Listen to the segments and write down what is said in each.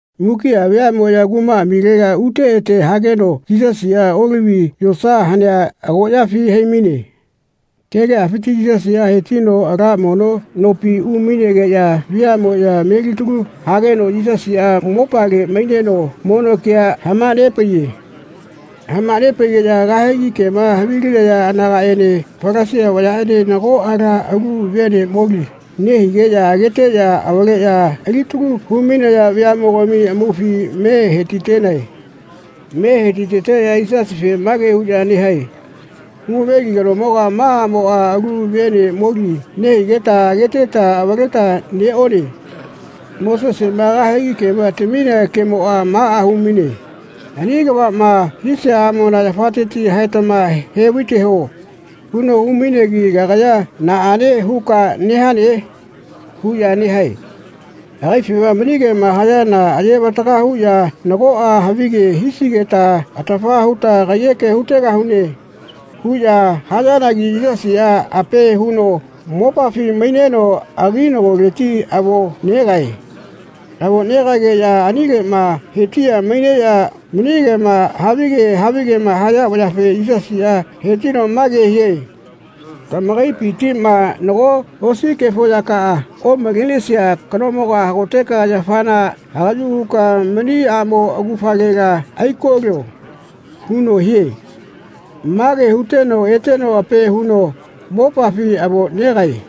Mukiꞌa veaꞌmoꞌya kumaꞌamilega ute ete hageno Yisasiꞌa Olivi yosa hanea agoꞌyafi hai-maine. Kegeꞌafiti Yisasiꞌa he-tino ala mono nopi umainegeꞌya veaꞌmoꞌya melitalu hageno Yisasiꞌa mopale maineno mono kea hama-nepaiye. Hama-nepaigeꞌya kahegi kema havilinaya anagaꞌene Falasia vayaꞌene nago ala alu vene moli nehigeꞌya ageteꞌya avaleꞌya alitalu hu-mainaya veaꞌmogami amaufi me he-ti-tenae. Me he-ti-teteꞌya Yisasife mage huꞌya nehae “Hu-maveli kanomoga ma aꞌmoꞌa alu vene moli nehigeta ageteta avaleta neꞌone. Moseseꞌma kahegi kema taminea kemoꞌa maꞌa hu-maine ‘Ani kavaꞌma hisia aꞌmona yafateti haetama he-vai-teho.’ huno hu-mainegi ‘Kagaya naꞌane huka nehane?’ huꞌya nehae. Agaifema mani kema hayana aye-vataga huꞌya nagoꞌa havige hisigeta atafa huta kaiyeke hu-tegahune.” huꞌya hayanagi Yisasiꞌa ape huno mopafi maineno aginagoleti avo negae. Avo negaegeꞌya anileꞌma he-tiꞌya maineꞌya mani kema havige havigema haya vayafe Yisasiꞌa he-tino mage hie “Tamakaipitiꞌma nago osi kefo yakaꞌa omalenesia kanomoga hagoteka yafana hagaꞌyu huka mani aꞌmo augafalela aiko-lio.” huno hie. Mage huteno eteno ape huno mopafi avo negae.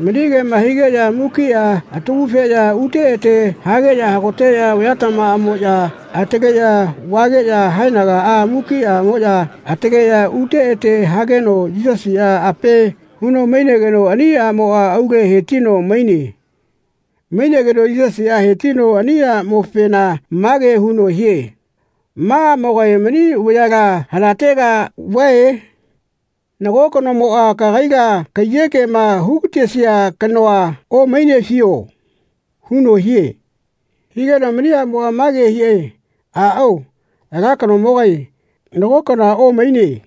Mani kema higeꞌya mukiꞌa atagu-feꞌya ute ete hageꞌya hagoteꞌya vayatamamoꞌya ataleꞌya vageꞌya haenaga mukiꞌamoꞌya ataleꞌya ute ete hageno Yisasiꞌa ape huno mainegeno ani aꞌmoꞌa aule he-tino maine. Mainegeno Yisasiꞌa he-tino ani aꞌmofena mage huno hie “Ma aꞌmogae mani vayala hanatega vae? Nago kanomoꞌa kagaila kaiyekema hu-gatesia kanoa omainefio?” huno hie. Higeno mani aꞌmoꞌa mage hie “Aꞌao, ala kanomogae, nago kanoa omaine.”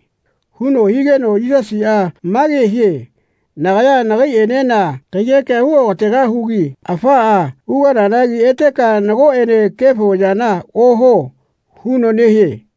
huno higeno Yisasiꞌa mage hie “Nagaya nagaiꞌenena kaiyekea hu okategahugi afaꞌa ugananagi eteka nagoꞌene kefo yana ohuo.” huno nehie.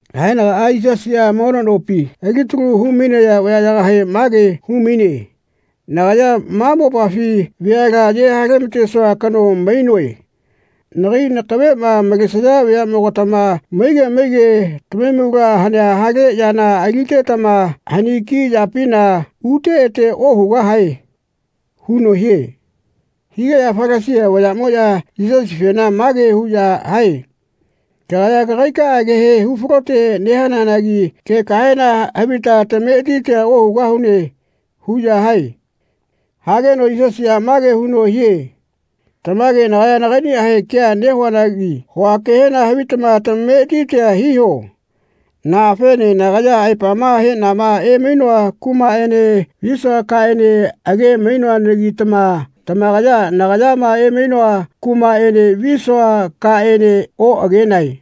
Haenagaꞌa Yisasiꞌa mono nopi alitalu hu-mainaya vayaꞌyagahe mage hu-maine “Nagaya ma mopafi veala aye hale-ma-tesua kano mainoe. Nagai nakaveꞌma malesaya veaꞌmogatama maige maige tamahaimula hanea hale yana alitetama haniki yapina ute ete ohugahae.” huno hie. Higeꞌya Falasia vayaꞌmoꞌya Yisasifena mage huꞌya hae “Kagaya kagaikaꞌa kehe hu-falote nehananagi kekahena havita tametiti ohugahune.” huꞌya hae. Hageno Yisasiꞌa mage huno hie “Tamage nagaya nagaiꞌniꞌahe kea nehuanagi hua kehena havitama tamameti hiho. Naꞌafene nagaya aepama heꞌnama emainoa kumaꞌene visua kaꞌene age-mainoanagitama tamakaya nagayama emainoa kumaꞌene visua kaꞌene oꞌagenae.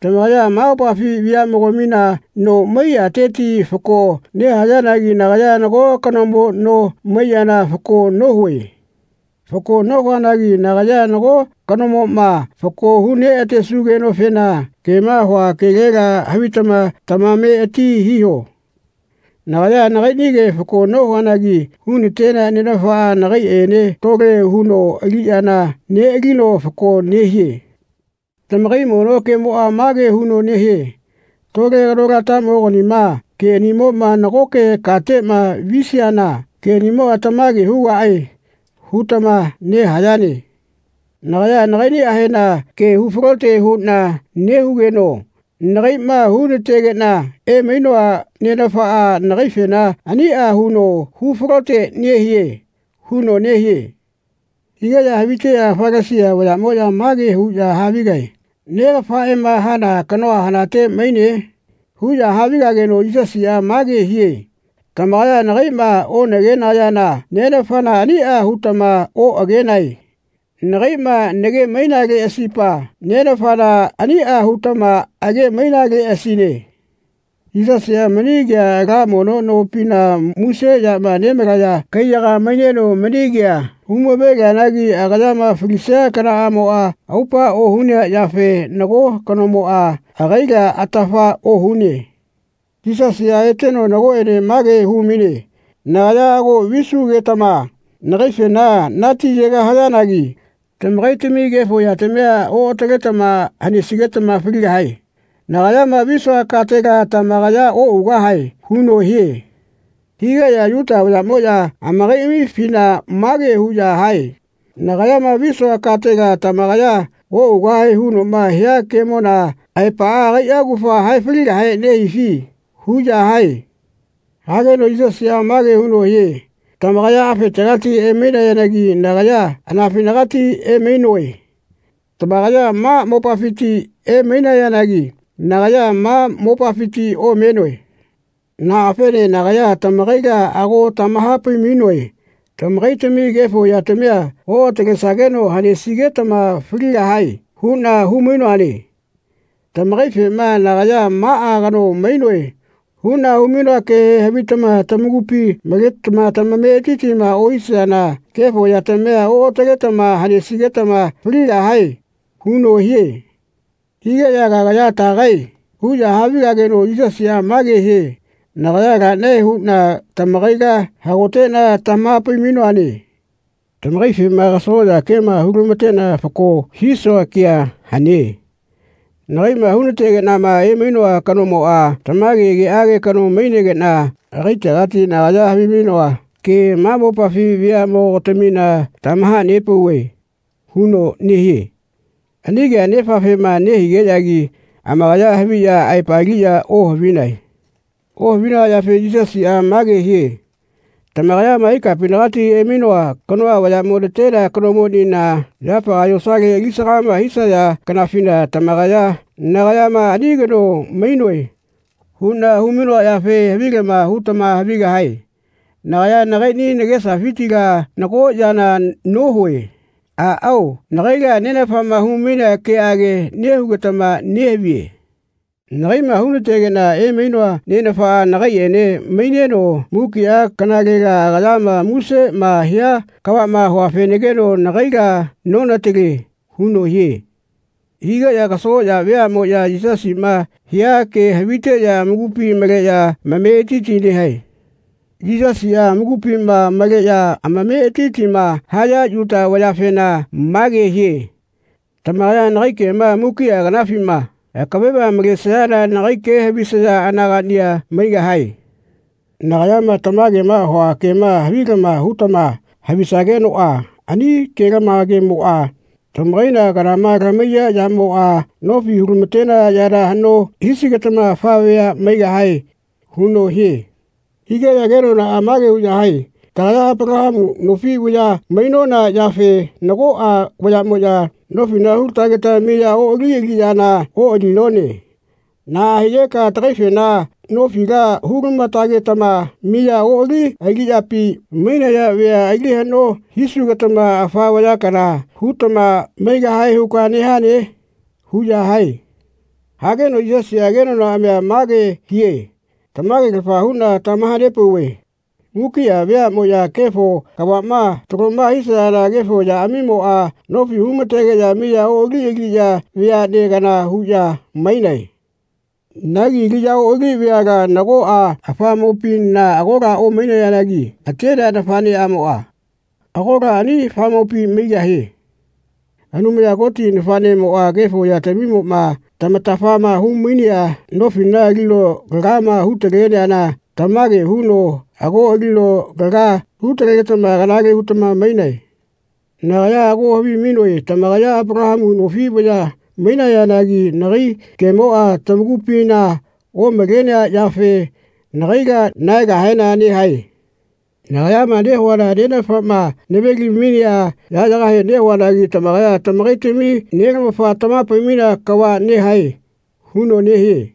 Tamakaya ma mopafi veaꞌmogamina no maiyateti fako nehayanagi nagaya nago kanomo no maiyana fako nohue. Fako nohuanagi nagaya nago kanomoma fako hu neꞌa-tesugenofena kema hua kelela havitama tamameti hiho. Nagaya nagaiꞌnige fako nohuanagi hu-natenea Nenafaꞌa nagaiꞌene tole huno aliꞌyana neꞌalino fako nehie. Tamakai mono kemoꞌa mage huno nehie ‘Tole kanolatamoganima keꞌanimoꞌma nagoke kateꞌma visiana keꞌanimoꞌa tamage hugaꞌe.’ hutama nehayane. Nagaya nagaiꞌniꞌahena kea hu-falote huꞌna nehugeno nagaiꞌma hu-nategeꞌna emainoa Nenafaꞌa nagaifena aniꞌa huno hu-falote nehie.” huno nehie. Higeꞌya haviteꞌya Falasia vayaꞌmoꞌya mage huꞌya havigae “Negafaꞌema hana kanoa hanate maine?” huꞌya havigageno Yisasiꞌa mage hie “Tamakaya nagaiꞌma onagenayana Nenafana aniꞌa hutama oꞌagenae. Nagaiꞌma nage-mainaleꞌasipa Nenafana aniꞌa hutama age-mainaleꞌasine.” Yisasiꞌa mani kea ala mono nopina muse yama nemalaya kaiyaga maineno mani kea hu-mave-lianagi agayama falisia kanaꞌamoꞌa aupa ohunea yafe nago kanomoꞌa agaila atafa ohune. Yisasiꞌa eteno nagoꞌene mage hu-maine “Nagaya ago visugetama nagaifena natiyegahayanagi tamakaitami kefo yatamia oꞌataletama hanesigetama faligahae. Nagayama visua katela tamakaya oꞌugahae.” huno hie. Higeꞌya Yuta vayaꞌmoꞌya amakaiꞌamifina mage huꞌya hae “Nagayama visua katela tamakaya oꞌugahae hunoꞌma hia kemona aepaꞌa agaiꞌa augafa hae-faligahe nehifi?” huꞌya hae. Hageno Yisasiꞌa mage huno hie “Tamakaya afetegati emainayanagi nagaya anafinagati emainoe. Tamakaya ma mopafiti emainayanagi nagaya ma mopafiti omenoe. Naꞌafene nagaya tamakaila ago tamaha-pai-mainoe ‘Tamakaitami kefo yatamia oꞌatalesageno hanesigetama faligahae.’ huꞌna hu-mainoane. Tamakaifema nagaya ‘Maꞌa kano mainoe.’ huꞌna hu-mainoa kehe havitama tamakupi maletama tamametitima ohisayana kefo yatamia oꞌataletama hanesigetama faligahae.” huno hie. Higeꞌya “Kagaya tagae?” huꞌya havigageno Yisasiꞌa mage hie “Nagaya laꞌnae huꞌna tamakaila hagoteꞌna tamaha-pai-mainoane. Tamakaifema kasagoꞌya kema, hu-lamateꞌna fako hisua kea hane. Nagaiꞌma hu-na-tegeꞌnama emainoa kanomoꞌa tamage keꞌage kano mainegeꞌna agaitegati nagaya havimainoa ke ma mopafi veaꞌmogatamina tamaha-nepauve.” huno nehie. Ani kea Nefafema nehigeꞌyagi amakaya haviꞌya aepaliꞌya ohavinae. Ohavinaya yafe Yisasiꞌa mage hie “Tamakayama ikapinagati emainoa kanoa vayaꞌmo natenea kanomoꞌnina yafaga yosale alisagama hisaya kanafina tamakaya nagayama ‘Ani kano mainoe.’ huꞌna hu-mainoa yafe havilama hutama havigahae. Nagaya nagaiꞌni nagesafitila nago yana nohue. Aꞌao nagaila Nenafama hu-mainea keꞌage nehugetama nehavie. Nagaiꞌma hu-natenegeꞌna emainoa Nenafaꞌa nagaiꞌene maineno mukiꞌa kanalela agayama museꞌma hia kavaꞌma huafenagino nagaila nonatale.” huno hie. Higeꞌya kasagoꞌya veaꞌmoꞌya Yisasiꞌma hia ke haviteꞌya amakupi maleꞌya amametiti nehae. Yisasiꞌa amakupima maleꞌya amametitima haya Yuta vayafena mage hie “Tamakaya nagai kema mukiꞌa kanafima akaveꞌma malesayana nagai ke havisaya anagaꞌniꞌa maigahae. Nagayama tamagema hua kema havilama hutama havisagenoꞌa ani ke-lamagemoꞌa tamakaila kanama lamahaiya yamoꞌa nofi hu-lama-tenaya yana haꞌno hisigetama afa vea maigahae.” huno hie. Higeꞌya kenonaꞌa mage hae “Tagaya Apalahamu nofi vaya mainona yafe nagoꞌa vayaꞌmoꞌya nofila hu-la-tageta miya oꞌali aliꞌyana oꞌalinone. Naꞌa higeka tagaifena nofila hu-lama-tagetama miya oꞌali aliꞌyapi mainaya vea ali haꞌno hisugetama afa vaya kana hutama maigahae huka nehane?” huꞌya hae. Hageno Yisasiꞌa kenonaꞌamia mage hie “Tamage-lafa huꞌna tamaha-nepauve mukiꞌa veaꞌma kefo kavaꞌma taloma hisayana kefo yaꞌamimoꞌa nofi hu-ma-tegeꞌya miya oꞌali aliꞌya veaꞌne kana huꞌya mainae. Nagi miya oꞌali aliꞌya veala nagoꞌa afamopina agola omaigahayanagi atenea nafaꞌneꞌamoꞌa agola ani afamopi maigahie. Anumaya Koti Nafaꞌnemoꞌa kefo yatamimoꞌma tamatafa hu-mainea nofila alino lagama hu-taleana tamage huno ago alino laga hu-talegetama kanale hutama mainae. Nagaya ago havimainoe tamakaya Apalahamu nofi vaya mainayanagi nagai kemoꞌa tamakupina omalenea yafe nagaila nahaegahena nehae. Nagayama nehuana Nenafaꞌma nave-li-mainea yaꞌyagahe nehuanagi tamakaya tamakaitami nelamafa tamaha-pai-mainea kava nehae.” huno nehie.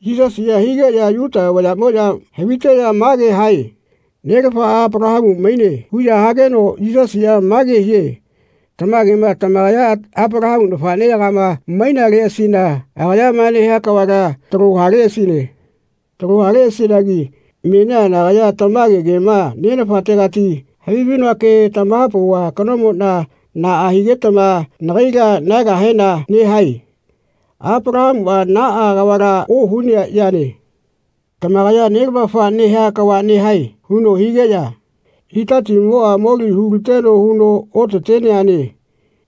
Yisasiꞌa higeꞌya Yuta vayaꞌmoꞌya haviteꞌya mage hae “Nelafaꞌa Apalahamu maine.” huꞌya hageno Yisasiꞌa mage hie “Tamagema tamakaya Apalahamu nafaꞌneyagama mainaleꞌasina agayama nehia kavala talo haleꞌasine. Talo haleꞌasinagi menia nagaya tamage kema Nenafategati havimainoa ke tamaha-pauva kanomonia naꞌa higetama nagaila nahaegahena nehae. Apalahamuꞌa naꞌa kavala ohunea yane. Tamakaya nelamafa nehia kava nehae.” huno higeꞌya “Itatimoꞌa moli hu-liteno huno otateneane.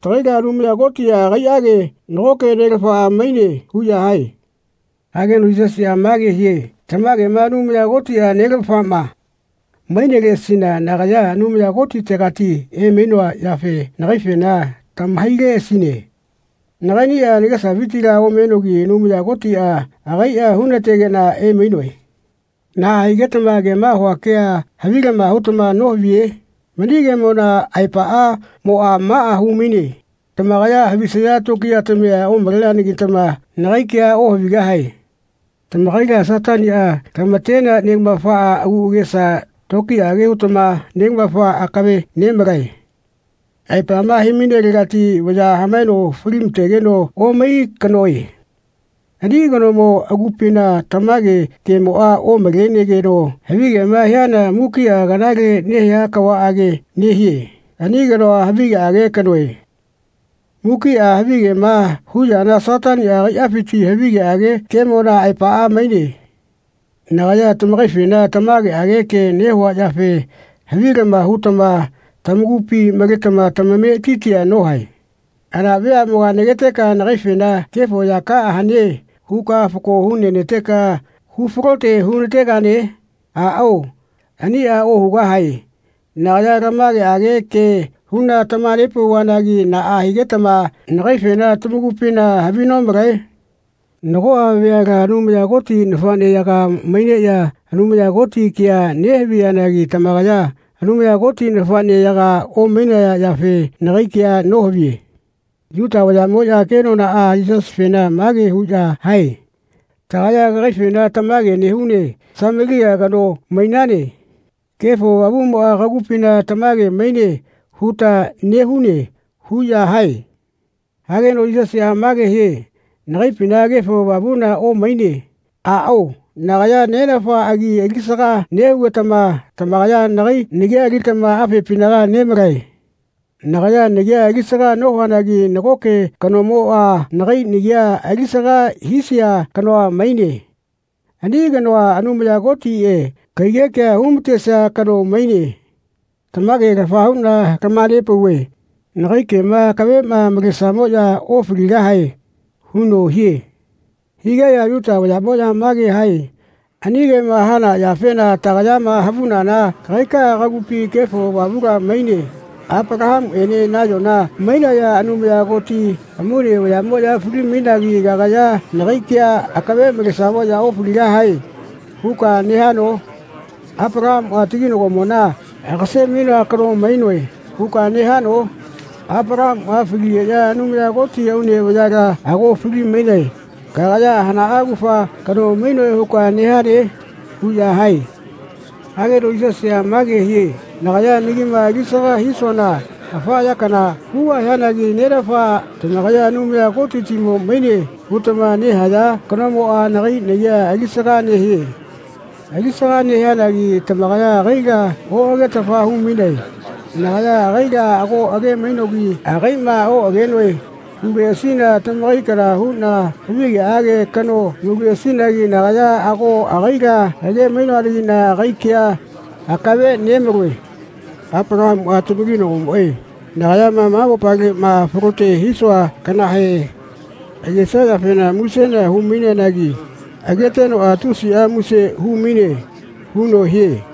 Tagaila Anumaya Kotiꞌa agaiꞌage nagoke nelafa maine.” huꞌya hae. Hageno Yisasiꞌa mage hie “Tamagema Anumaya Kotiꞌa nelamafaꞌma maineleꞌasina nagaya Anumaya Kotitegati emainoa yafe nagaifena tamahaileꞌasine. Nagaiꞌniꞌa nagesafitila omenogi Anumaya Kotiꞌa agaiꞌa hu-na-tegeꞌna emainoe. Naꞌa higetama kema hua kea havilama hutama nohaviye? Mani kemona aepaꞌamoꞌa maꞌa hu-maine tamakaya havisaya tokiyatamia omaleanegitama nagai kea ohavigahae. Tamakaila Sataniꞌa lama-tenea nelamafa agu agesa tokiyaꞌage hutama nelamafa akave nemalae. Aepama he-mainelegati vaya hamaeno fali-ma-tegeno omai kanoe. Ani kanomo agupina tamage kemoꞌa omalenegeno havigema hiana mukiꞌa kanale nehia kava nehie. Ani kanoa havigeꞌage kanoe. Mukiꞌa havigema hu yana Sataniꞌa agaiꞌafiti havigeꞌage kemona aepaꞌa maine. Nagaya lamakaifena tamageꞌage ke nehua yafe havilama hutama tamakupi maletama tamametitia nohae. Hana veaꞌmoga nageteka nagaifena ‘Kefo yakaꞌa hane.’ huka fako hu-nena-teka hu-falote hunategane? Aꞌao, aniꞌa ohugahae. Nagaya lamageꞌage kea huꞌna tamaha-nepauvanagi naꞌa higetama nagaifena tamakupina havi nomalae? Nagoꞌa veala Anumaya Koti nafaꞌneyaga maineꞌya Anumaya Koti kea nehaviyanagi tamakaya Anumaya Koti nafaꞌneyaga omainaya yafe nagai kea nohaviye.” Yuta vayaꞌmoꞌya kenonaꞌa Yisasifena mage huꞌya hae “Tagaya kagaifena tamage nehune ‘Samelia kano mainane. Kefo Avamuꞌmoꞌa kagupina tamage maine.’ huta nehune.” huꞌya hae. Hageno Yisasiꞌa mage hie “Nagaipina Kefo Avamula omaine. Aꞌao nagaya Nenafa agi alisaga nehugetama lamakaya nagai nagia alitama afepinaga nemalae. Nagaya nagia alisaga nohuanagi nagoke kanomoꞌa nagai nagia alisaga hisia kano maine. Ani kanoa, Anumaya Kotiꞌe, kaiyekea hu-ma-tesia kano maine. Tamage-lafa huꞌna lamaha-pauve nagai kema akaveꞌma malesamoꞌya ofaligahae.” huno hie. Higeꞌya Yuta vayaꞌmoꞌya mage hae “Ani kema hana yafena tagayama havunana kagaikaꞌa kagupi Kefo Avamula maine. Apalahamuꞌene nayona mainaya Anumaya Koti amaune vayaꞌmoꞌya fali-mainagi kagaya ‘Nagai ke akave malesamoꞌya ofaligahae.’ huka nehano? Apalahamuꞌa taginagomona ‘Agase-mainoa kano mainoe.’ huka nehano? Apalahamuꞌa faligeꞌya Anumaya Koti aune vayala ago fali-mainae. Kagaya hanaꞌa augafa kano mainoe huka nehane?” huꞌya hae. Hageno Yisasiꞌa mage hie “Nagaya nagima alisaga hisuana afa ya kana hugahianagi Nenafa tamakaya ‘Anumaya Kotitimo maine.’ hutama nehaya kanomoꞌa nagai nagia alisaga nehie. Alisaga nehianagi tamakaya agaila oꞌagetafa hu-mainae. Nagaya agaila ago age-mainogi ‘Agaiꞌma oꞌagenoe.’ huleꞌasina tamakai kana huꞌna havigeꞌage kano mauleꞌasinagi nagaya ago agaila age-mainoanagiꞌna agai kea akave nemaloe. Apalahamuꞌa tamakinagomoꞌe nagayama ma mopaleꞌma falote hisua kanahe agesia yafena musena hu-maineanagi agetenoꞌa tusiꞌa muse hu-maine.” huno hie.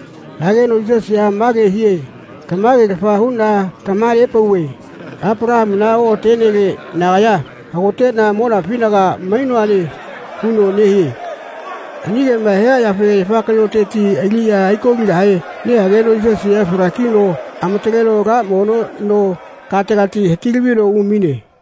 Hageno Yisasiꞌa mage hie “Tamage-lafa huꞌna tamaha-nepauve Apalahamuna oꞌatenele nagaya hagoteꞌna monafinaga mainoane.” huno nehie. Ani kema hia yafe yafa kaꞌyoteti aliꞌya aiko-ligahe nehageno Yisasiꞌa fala-kino amataleno ala mono no kategati hati-lavino umaine.